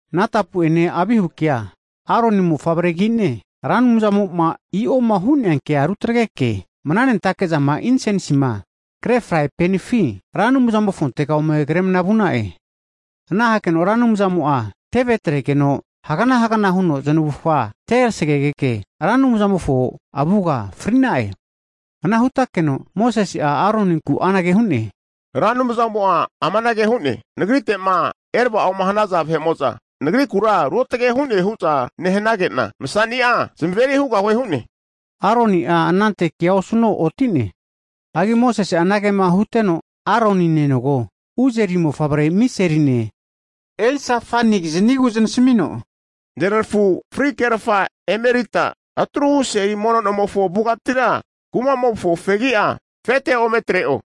Natapu'ene Avihukea Aroni ne' mofavregi'ne, Ra Anumzamo'ma i'oma hu'nea kea rutagreke, mnanentake'zama insensima kre fraipanifi Ra Anumzamofontega ome kremna vu'na'e. Ana hakeno Ra Anumzamo'a teve atregeno hagnahagna huno znavufga terasagegeke, Ra Anumzamofo avuga fri'na'e. Ana hutakeno Mosese'a Aroninku anage hu'ne, Ra Anumzamo'a amanage hu'ne, nagrite'ma eravao'ma hanaza vahe'mo'za Nagrikura ruotage hu'ne hu'za nehanage'na, masani'a zamaveri hugahue hu'ne. Aroni'a anante kea osuno oti'ne. Hagi Mosese'a anage'ma huteno, Aroni nenogo Uzari mofavre Miseline Elsafanikizanigu zanasamino, neranafu fri kerafa emerita atruhu seli mono nomofo avugatira kuma'mofo fegi'a afete ome atre'o,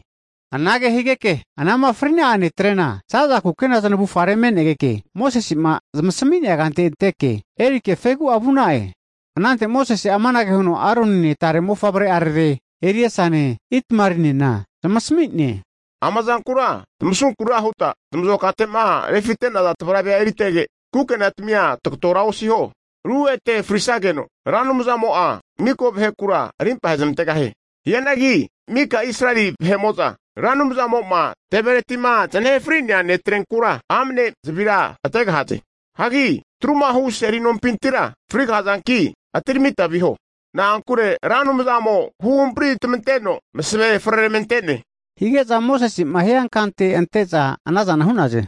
anage higeke anama fri'na'a netre'na za'za kukena znavufare me'negeke Mosese'ma zamasami'nea kante anteke erike fegi'a vu'na'e. Anante Mosese'a amanage huno Aronine tare mofavre'arare Eleasane, Itamarinena zamasmi'ne, Ama zankura tamasunkura huta tamazokate'ma refite'naza tavrave eritrege, kukenatamia tagotora osiho, ru ete frisageno Ra Anumzamo'a mika vahekura arimpa ahezamantegahie. Hianagi mika Israeli vahe'mo'za Ra Anumzamo'ma tevereti'ma znahe fri'nea netretrenkura amane zavira ategahaze. Hagi atrumahu Seli nompintira frigahazanki atiramita oviho. Na'ankure Ra Anumzamo huhampritamanteno masavea freramante'ne. Hige'za Mosesema hiankante ante'za anazana hu'naze.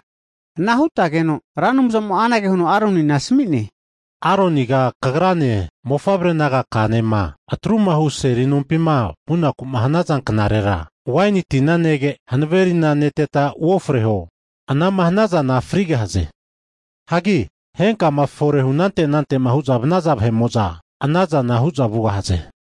Ana hutageno, Ra Anumzamo'a anage huno Aronina asami'ne, Aroniga kagrane mofavre nagaka'anema Atrumahu Seli Nompima vunaku'ma hanaza knarera waini tina nege, hanave tina neteta uofreho, ana'ma hanazana frigahaze. Hagi henkama fore hunante anante'ma hu'zama vanaza vahe'mo'za anazana hu'za vugahaze.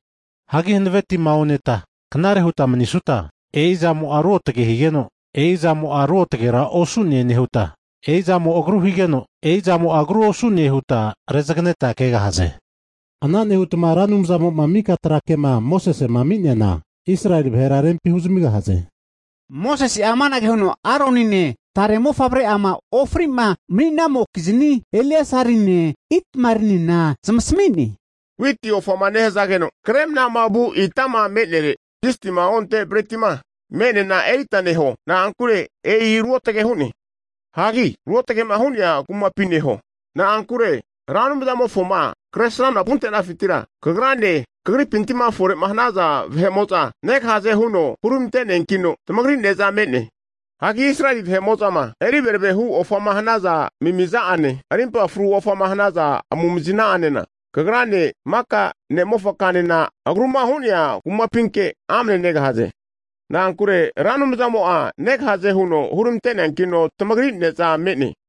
Hagi hanave tima oneta knare huta manisuta, e'izamo'a ruotage higeno, e'izamo'a ruotagera osu'ne nehuta, e'izamo agru higeno, e'izamo'a agru osu'ne huta rezageneta kegahaze. Ana nehutma Ra Anumzamo'ma mika trakema Mosesema ami'neana, Israeli vahera rempi huzamigahaze. Mosese'a amanage huno Aronine tare mofavre'ama ofri'ma mani'namokizni Eleasarine, Itamarinena zamasmi'ne, Witi ofama nehazageno kre mana vu ita me'nere zistima onte bretima me'neana erita neho, na'ankure e'i ruotage hu'ne. Hagi ruotage'ma hu'nea kumapi neho. Na'ankure Ra Anumzamofoma kresramna vuntenafintira kagrane kagripintima fore hanaza vahe'mo'za negahaze huno huramante'neankino, tamagri ne'za me'ne. Hagi Israeli vahe'mo'zama eriverave hu ofama hanaza amimiza'ane, arimpa fru ofama hanaza amumazina'anena kagrane maka ne'mofakanena agruma hu'nea kumapinke amane negahaze. Na'ankure Ra Anumzamo'a negahaze huno huramante'neankino tamagri ne'za me'ne.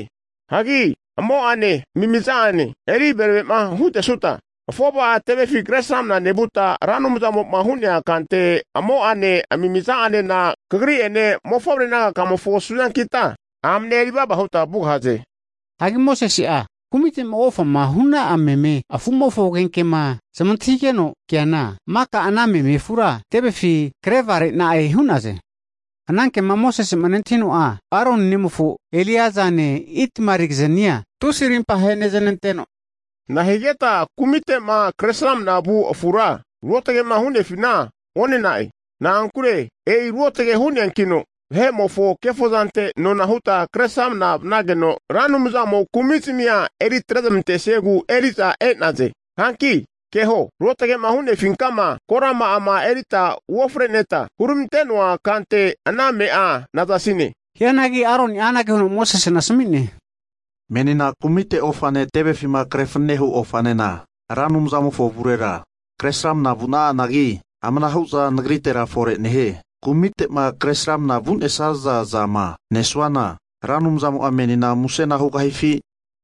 Hagi amo'ane amimiza'ane eri verave'ma hutesuta, afova'a tevefi kresramna nevuta Ra Anumzamo'ma hu'nea kante, amo'ane amimiza'anena kagri'ene mofavre nagakamofo suzankita, amne eri vava huta vugahaze. Hagi Mosese'a kumite'ma ofama hu'na'a meme afu'mofo agenkema zamantahigeno keana, maka ana meme afura tevefi krevare'na'e hu'naze. Anankema Mosese'ma nentahino'a, Aroni nemofo Eleazane Itamalikiznia tusi arimpa aheneznanteno, nahigeta kumite'ma kresramna vu afura ruotage'ma hu'nefina one'na'e? Na'ankure e'i ruotage hu'neankino, vahe'mofo kefozante nona huta kresramna vanageno, Ra Anumzamo'a kumizmia eritrezmantesiegu eri'za e'naze. Hanki keho, ruotage'ma hu'nefinkama korama'a erita uofreneta huramante'noa kante ana ame'a nazasine. Hianagi Aroni'a anage huno Mosesena asami'ne, Menina kumite ofane tevefima krefanane hu ofanena Ra Anumzamofo avurera kresramna vu'na'anagi, amanahu zana nagritera fore nehie. Kumite'ma kresramna vu'nesaza zama nesuana Ra Anumzamo'a menina musena hugahifi?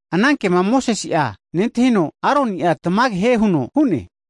Anankema Mosese'a nentahino, Aroni'a tamage hie huno hu'ne.